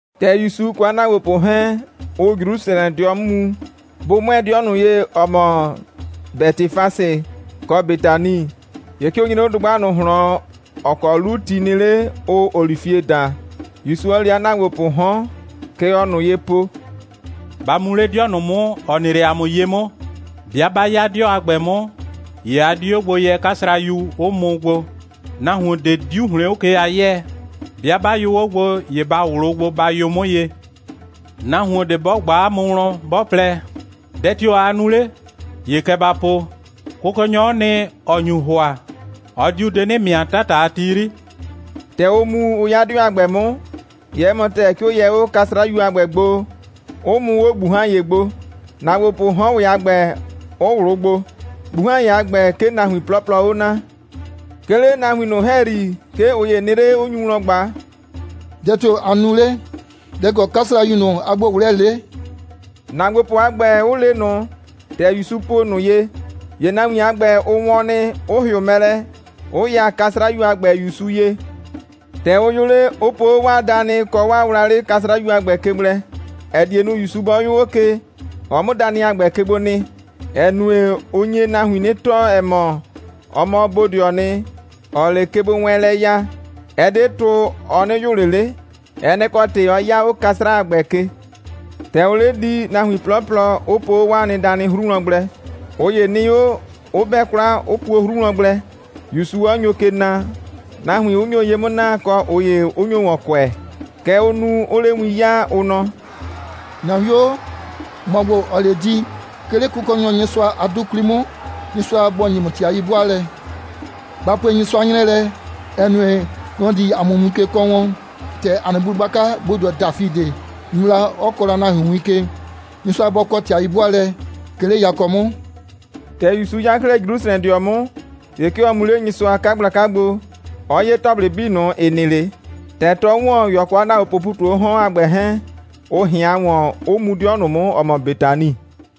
‑Tɛ ‑Yusu kɔ 'a ‑naagbopʋ 'hɛɛn, ʋʋ Jrusrɛdɩɔ 'mʋ mu, bʋ 'mʋɛɛ 'dɩɛ ꞊nʋ ye, ‑ɛ mɔ Bɛtɩfase kɔ Betani, ‑ye 'ke ʋ nyre 'o dʋgba ꞊nʋ ꞊hlɔn, ‑ɔ kɔ 'lu ti nɩ 'le, ʋʋ olifie daa, ‑Yusu 'ɔ le 'a ‑naagbopʋʋ 'hɔn. Kɛ ɔɔ ꞊nʋ ye po: «Ba mu 'le 'dɩɔ ꞊nʋ 'mʋ, ‑ɔ nɩ 'le 'a mʋ ye 'mʋ. 'Bɩa 'ba 'ya 'dɩɔ a ‑gbɛ 'mʋ, ‑ye a di 'o gbo yɛ 'kasrayu, 'ʋ mʋ gbo. Nahuon ꞊de 'diu ‑hlɩn 'o ke a 'yɛɛ. 'Bɩa 'ba yʋ 'o gbo, ‑ye ba ꞊wlʋʋ gbo, ba yʋ 'mʋ ye. Nahuon ꞊de 'bɔ ꞊gba 'a mʋ wlɔn, 'bɔ plɛ: Dɛ tio‑ aa nu 'le? ‑ye kɛ ba po: Kʋkɔnyɔ'ɔ nɩ, ‑ɔ nyu ‑hʋa. Ɔ diu de 'nɩ ‑mɩa 'tata a ti 'yri.» ‑Tɛ ʋ mu, 'ʋ 'ya 'dɩɔ a ‑gbɛ 'mʋ, ‑ye 'ɛ mɔ ‑tɛɛ, 'ke ʋ yɛ 'o 'kasrayu a ‑gbɛ gbo, 'ʋ mʋ 'o ꞊gbuhan.ye gbo, ‑naagbopʋʋ 'hɔn ‑wɛ a ‑gbɛ, 'ʋ ꞊wlʋʋ gbo. ꞊Gbuhan.ye a ‑gbɛ, 'ke nahuin 'plɔplɔɔ 'o naa. 'Ke 'le nahuin ꞊nʋ ‑hɛyri, 'ke ꞊ʋ ‑ye nɩ 'le, 'ʋ nyu wlɔn ꞊gba: «Dɛ tio‑ aa nu 'le? Dɛ‑ kɔ 'kasrayu ꞊nʋ a gbo꞊wlɛɛlɛ 'le?» ‑naagbopʋ a ‑gbɛ 'ʋ le ꞊nʋ, ‑tɛ ‑Yusu po ꞊nʋ ye, ‑ye nahuin a ‑gbɛ, ʋ wɔn nɩ, 'ʋ ‑hɩʋ mɛ lɛ, 'ʋ ya 'kasrayu a ‑gbɛ ‑Yusu ye. ‑Tɛ ʋ yʋ 'le, 'ʋ po 'o 'waa danɩ kɔ wlawlɩ 'kasrayu a ‑gbɛ ke gblɛ, ‑ɛ die nu, ‑Yusu 'bɔ 'yʋ 'o ke, ɔ 'mʋ danɩ a ‑gbɛ ke gbo nɩ. (‑Ɛ nue, ɔ nye nahuin 'nɩ tɔɔ, ‑ɛ mɔ, ɔ mɔ bodɩɔɔ nɩ, ‑ɔɔ 'le kegbowɛɛnlɛ ya. Ɛ 'de tʋ, ɔ 'nɩ yʋ ꞊le 'le. Ɛ nɛ‑ kɔ ‑tɩ, 'ɔ 'ya 'o 'kasra a ‑gbɛ ke.) ‑Tɛ ʋʋ 'le di, nahuin 'plɔplɔ 'ʋ po 'o 'waa nɩ danɩ 'hru wlɔn gblɛ. ꞊Ʋ ‑ye nɩ 'o, 'ʋ 'bɛ 'kwla, 'ʋ puo 'o 'hru wlɔn gblɛ, ‑Yusu 'ɔ nyo ke na, nahuin 'ʋ nyo ye 'mʋ na, kɔ ꞊ʋ ‑ye 'ʋ nyo ‑wɔn kʋɛ. Kɛ ʋʋ nu, 'ʋʋ 'le win 'yaa, ʋ nɔ: «‑Na 'wio, ‑mɔ ‑gbo, ‑ɔɔ 'le di, 'ke 'le Kʋkɔnyɔ Nyɩsʋa a 'dʋ 'kwli 'mʋ. Nyɩsʋa bɔ ‑nye ‑mʋ ‑tɩ a 'yi'bʋaalɛ! Ba pue Nyɩsʋa 'nyrɛɛ lɛ, ‑ɛ nue, nɔ‑ di ‑a mʋ win ke kɔɔ wɔn, ‑tɛ ‑a nɩ bu gblaka bodɩɔ Dafidɩ nu la, 'ɔ kɔɔ la nahuin win ke. Nyɩsʋa bɔ kɔ ‑tɩ a 'yi'bʋaalɛ, 'ke 'le yakɔ 'mʋ!» ‑Tɛ ‑Yusu 'ya 'klɛɛ Jrusrɛdɩɔ 'mʋ, ‑ye 'ke ɔ mu 'le Nyɩsʋa a 'kagblaka gbo, 'ɔ 'ye ‑tɔplɩ 'bii ꞊nʋ, ‑ɩ nɩ 'le. ‑Tɛ 'tɔɔ ‑wɔn, ‑ye ɔ kɔ 'a ‑naagbopʋʋ ‑pu ꞊tu 'o 'hɔn a ‑gbɛ 'hɛɛn, ʋ ꞊hɩan ‑wɔn, 'ʋ mu 'dɩɔ ꞊nʋ 'mʋ, ‑ɔ mɔ Betani.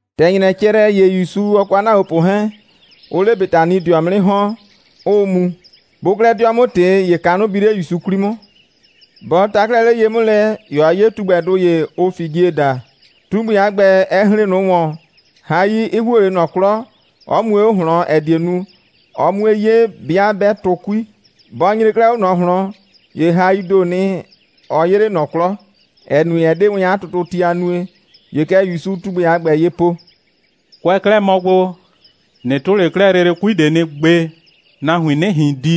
‑Tɛ ‑nyrɛ cɛ lɛ, ‑ye ‑Yusu, ɔ kɔ 'a ‑naagbopʋ 'hɛɛn, ʋʋ 'le Betanidɩɔ 'mʋ 'nɩ ‑hɔn, 'ʋʋ mu. Bʋʋ 'klɛɛ 'dɩɔ 'mʋ ꞊tɩ, ‑ye kanʋ bi 'le ‑Yusu 'kwli 'mʋ. Bɔ ta 'klɛɛ 'le ye 'mʋ lɛ, ‑ye ɔ 'ye tugbɛdʋ ‑ye, ʋʋ figie daa. Tugbɛ a ‑gbɛ, ɛ hren ꞊nʋ ‑wɔn, hai 'ɩ ‑huo 'le ꞊nɔ 'klɔ, 'ɔ mue 'o ꞊hlɔn, ‑ɛ die nu, ɔ 'mue 'ye, 'bɩa 'bɛ tʋ 'kui. Bɔ nyre 'klɛɛ 'o ꞊nɔ ꞊hlɔn, ‑ye haii ‑doo nɩ, ɔ 'yee 'le ꞊nɔ 'klɔ, ‑ɛ nue, ɛ 'de wɛn 'a tʋtʋti a nue. ‑Ye kɛ ‑Yusuu tugbɛ a ‑gbɛ ye po: «Kʋɛ kɛ 'klɛɛ mɔ gbo, ꞊nɩ tʋ 'le 'klɛɛ lele 'kui ꞊de nɩ gbe, nahuin 'nɩ ꞊hin di!»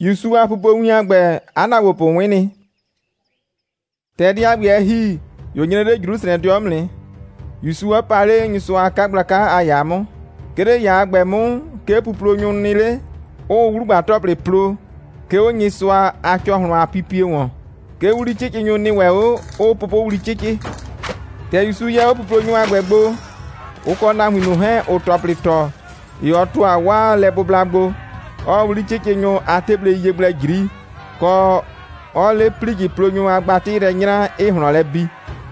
‑Yusu a pupowin a ‑gbɛ, 'a ‑naagbopʋ 'wɩn nɩ. ‑Tɛ dɛ a ‑gbɛ, ɛ ‑hi, ‑ye ʋ nyre 'le Jrusrɛdɩɔ 'mʋ nɩ, ‑Yusu 'ɔ pa 'le Nyɩsʋa a 'kagblaka a ‑yaa 'mʋ. 'Ke 'le ‑yaa a ‑gbɛ 'mʋ, 'ke puplonyʋ nɩ 'le, 'ʋʋ 'wlugba‑tɔplɩ plo, 'ke 'o Nyɩsʋa a ‑cɔhlʋn a pipie ‑wɔn. 'Ke 'wli'cɩcɩnyʋ nɩ ‑wɛ 'o, 'ʋʋ pʋpʋwli 'cɩcɩ. ‑Tɛ ‑Yusu yɛ 'o puplonyʋ a ‑gbɛ gbo, ʋ kɔ nahuin ꞊nʋ 'hɛɛn, ‑ʋʋ ‑tɔplɩ ‑tɔ, ‑ye ɔ ‑tʋa 'waa lɛbʋbla gbo, 'ɔɔ 'wli'cɩcɩnyʋ a 'teblei ye gblɛ ꞊jri, kɔ, 'ɔɔ 'le ‑plijɩplonyʋ a gbatɩ yrɛ 'nyraa, 'ɩɩ ꞊hlɔn lɛ bi,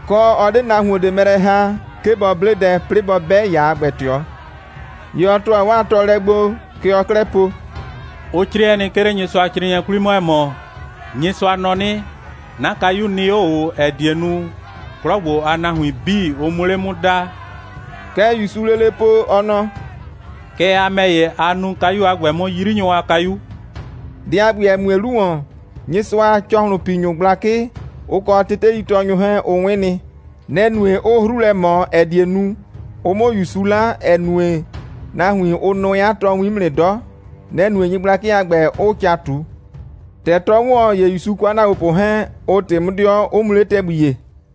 kɔ, 'ɔ 'de 'a nahuon ꞊de mɛ lɛ ‑ha, 'ke bɔ 'ble dɛ, 'plɩɩ bɔ 'bɛ ‑yaa a ‑gbɛ ꞊tɩɔ. ‑Ye ɔ ‑tʋa 'waa tɔɔlɛ gbo, kɛ ɔɔ 'klɛɛ po: «Ʋ 'crɩɛ nɩ, 'ke 'le Nyɩsʋacrɩɩnɩɛ 'kwli 'mʋ, ‑ɛ mɔ: Nyɩsʋa nɔ 'nɩ: 'Na kayu nɩ 'o ꞊o, ‑ɛ die nu, 'klɔ ‑gbo a nahuin 'bii, ʋ 'mʋ 'le 'mʋ daa.» Kɛ ‑Yusuu lele po, ɔ nɔ: «Kɛɛ ‑ye a ‑mɛ ‑ye, a nuu kayu a ‑gbɛ 'mʋ 'yrinyʋ a kayu.» Dɛ a ‑gbɛ, ‑ɛ mue 'lu ‑wɔn, Nyɩsʋa a ‑cɔhlʋnpinyʋ gblakɩ, ʋ kɔ teteitɔɔnyʋ 'hɛɛn, ʋ 'wɩn nɩ. Nɛ‑ nue, 'ʋʋ 'hru lɛ ꞊mɔ, ‑ɛ die nu, ʋ 'mʋ ‑Yusu 'la, ‑ɛ nue, nahuinŋ, ʋ nʋɛ 'a tɔɔwin 'mʋ nɩ 'dɔ. Nɛ‑ nue, nyɩgblakɩ a ‑gbɛ 'ʋʋ ca ꞊tu. ‑Tɛ 'tɔɔ ‑wɔn, ‑ye ‑Yusu kɔ 'a ‑naagbopʋ 'hɛɛn, ʋ ꞊tɩ 'mʋ 'dɩɔ, 'ʋ mu 'le ‑tɛgbi ‑ye.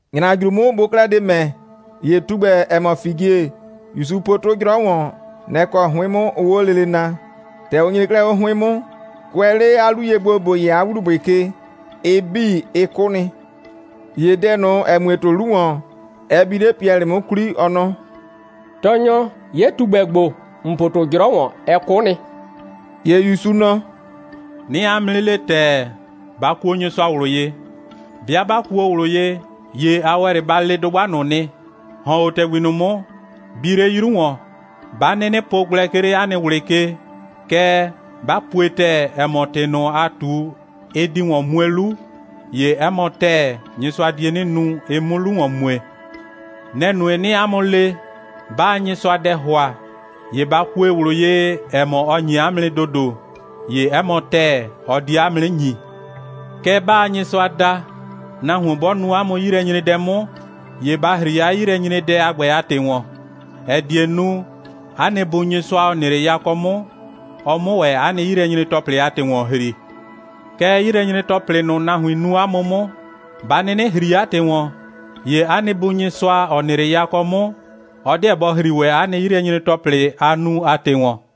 ‑Nyrajru 'mʋ, bʋʋ 'klɛɛ de ‑mɛ, ‑ye tugbɛ, ‑ɛ mɔ figie, ‑Yusu po 'tʋ 'jrɔ ye, nɛ‑ kɔ 'hʋɩn 'mʋ ʋʋ 'o lele naa. ‑Tɛ ʋ nyre 'klɛɛ 'o 'hʋɩn 'mʋ, kʋɛ 'le 'a 'lu ye gbo, ‑bo yɛ 'a ‑wlubʋɩ ke, ɩ 'bii, ɩ 'kʋ nɩ. ‑Ye dɛ ꞊nʋ, ‑ɛ mue 'tʋ 'lu ‑wɔn, ɛ bi 'le Piɛlɩ 'mʋ 'kwli, ɔ nɔ: «Tɔɔnyɔ, 'ye tugbɛ ‑gbo, ‑n po 'tʋ 'jrɔ ‑wɔn, ɛ 'kʋ nɩ.» ‑Ye ‑Yusu nɔ: «'Nɩɩ 'a mʋ 'nɩ le ‑tɛɛ, ba kuo Nyɩsʋa ꞊wlʋ ye! 'Bɩa 'ba kuo ꞊wlʋ ye, ‑ye a ‑wɛ 'le ba le dʋgba ꞊nʋ nɩ: ‑Hɔn 'o ‑tɛgbi ꞊nʋ 'mʋ, bi 'le 'yru ‑wɔn! 'Ba 'nɩnɩ po gblɛ, 'ke 'le 'a nɩ ꞊wlɩ ke, kɛɛ, 'ba pue ‑tɛɛ, ‑ɛ mɔ, ‑tɩ ꞊nʋ, a ꞊tu, ɩ di ‑wɔn mue 'lu, ‑ye 'ɛ mɔ ‑tɛɛ, Nyɩsʋa die 'nɩ nu, ɩ 'mʋ 'lu ‑wɔn mue. Nɛ‑ nue, 'nɩɩ 'a mʋ le, 'baa Nyɩsʋa dɛ ‑hʋa, ‑ye ba kue ꞊wlʋ ye, ‑ɛ mɔ, ɔ ‑nye 'a mʋ nɩ ‑dodo, ‑ye 'ɛ mɔ ‑tɛɛ, ɔ die 'a mʋ 'nɩ ‑nyi. Kɛɛ, 'baa Nyɩsʋa da, nahuon 'bɔ nu 'a mʋ 'yilɛnyredɛ 'mʋ, ‑ye ba ‑hri 'a 'yilɛnyredɛ a ‑gbɛ a ‑tɩ ‑wɔn, ‑ɛ die nu, 'a nɩ Bu Nyɩsʋa, ‑ɔ nɩ 'le yakɔ 'mʋ, ɔ 'mʋ ‑wɛ 'a nɩ 'yilɛnyre‑tɔplɩ a ‑tɩ ‑wɔn ‑hri. [ Kɛɛ, 'yilɛnyre‑tɔplɩ ꞊nʋ, nahuin nu 'a mʋ 'mʋ, 'ba 'nɩnɩ ‑hri 'a ‑tɩ ‑wɔn, ‑ye 'a nɩ Bu Nyɩsʋa, ‑ɔ nɩ 'le yakɔ 'mʋ, ɔ 'deɛ bɔ ‑hri ‑wɛ 'a nɩ 'yilɛnyre‑tɔplɩ, a nu a ‑tɩ ‑wɔn.]»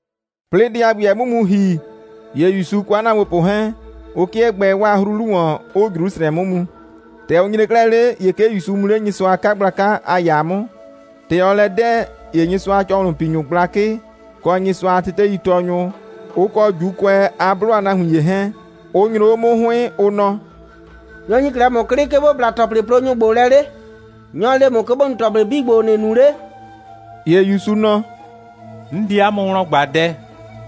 'Plɩɩ dɛ a ‑gbɛ, ɛ 'mʋ mu ‑hi, ‑ye ‑Yusu kɔ 'a ‑naagbopʋ 'hɛɛn, ʋ 'kɩɛ gbɛɛ 'waa 'hru 'lu ‑wɔn, ‑ʋʋ Jrusrɛdɩɔ 'mʋ mu. ‑Tɛ ʋ nyre 'klɛɛ 'le, ‑ye 'ke ‑Yusu mu 'le Nyɩsʋa a 'kagblaka a ‑yaa 'mʋ. ‑Tɛ ɔɔ lɛ 'dɛɛ, ‑ye Nyɩsʋa a ‑cɔhlʋnpinyʋ gblakɩ, kɔ Nyɩsʋa a teteitɔɔnyʋ, ʋ kɔ ‑Juukʋɛ a 'blʋ a nahuin ‑ye 'hɛɛn, ʋ nyro 'o 'mʋ 'hʋɩn, ʋ nɔ: «Nyɔ‑ ‑nyi 'klɛɛ ‑mʋ 'klɩ, 'ke ‑bo bla ‑tɔplɩplonyʋ ‑gbo lɛ 'le? Nyɔ‑ le ‑mʋ, 'ke ‑bo nu ‑tɔplɩ 'bii ‑gbo, ‑nɩɩ nu 'le?» ‑Ye ‑Yusu nɔ: «'N di ‑wɛ 'a mʋ wlɔn ꞊gba dɛ.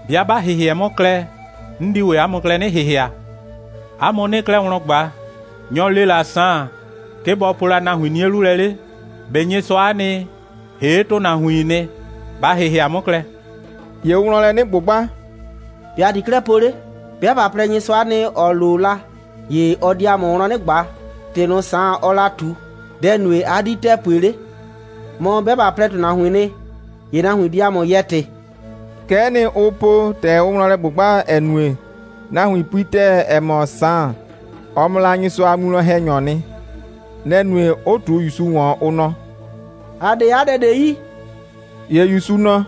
'Bɩa 'ba ‑hɩhɩɛ 'mʋ klɛ, ‑ye 'n di 'a mʋ klɛ 'nɩ ‑hɩhɩa. 'A mʋ 'nɩɩ 'klɛɛ wlɔn ꞊gba: Nyɔ‑ le la Saan, 'ke bɔ po la nahuin 'nie 'lu lɛ 'le? ꞊Be Nyɩsʋa'a nɩ, ‑hee' ‑tʋnahuiin nɩ? Ba ‑hɩhɩa 'mʋ klɛ!» ‑Ye ʋʋ wlɔn lɛ 'nɩ ꞊gbʋgba: «‑Be' ‑a di 'klɛɛ po 'le? 'Bɩa ꞊ba plɛ: Nyɩsʋa'a nɩ, ‑ɔ lo la, ‑ye ɔ di ‑a mʋ wlɔn 'nɩ ꞊gba: ‑Tɩ ꞊nʋ, Saan, ɔɔ la ꞊tu, dɛ‑ nue, 'a 'di la ‑tɛɛ pue 'le? Mɔ, 'bɩa ꞊ba plɛ, ‑tʋnahuiin nɩ, ‑ye nahuin di ‑a mʋ yɛɛ ‑tɩ.» Kɛ'ɛ nɩ, ʋ po, ‑tɛ ʋʋ wlɔn lɛ ꞊gbʋgba, ‑ɛ nue, nahuin pui ‑tɛɛ, ‑ɛ mɔ, Saan, ɔ mɔ la Nyɩsʋa a winwlɔn‑hɛnyɔɔ nɩ. Nɛ‑ nue, 'ʋ ꞊tu ‑Yusu ‑wɔn, ʋ nɔ: «‑A 'de 'a dɛ ꞊de yi.» ‑Ye ‑Yusu nɔ: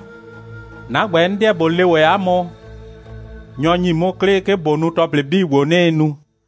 «'Na ‑gbɛ, 'n 'deɛ ꞊bo le ‑wɛ 'a mʋ, nyɔ‑ ‑nyi 'mʋ 'klɩ, 'ke ꞊bo nu ‑tɔplɩ 'bii ‑gbo, 'nɩɩ nu.»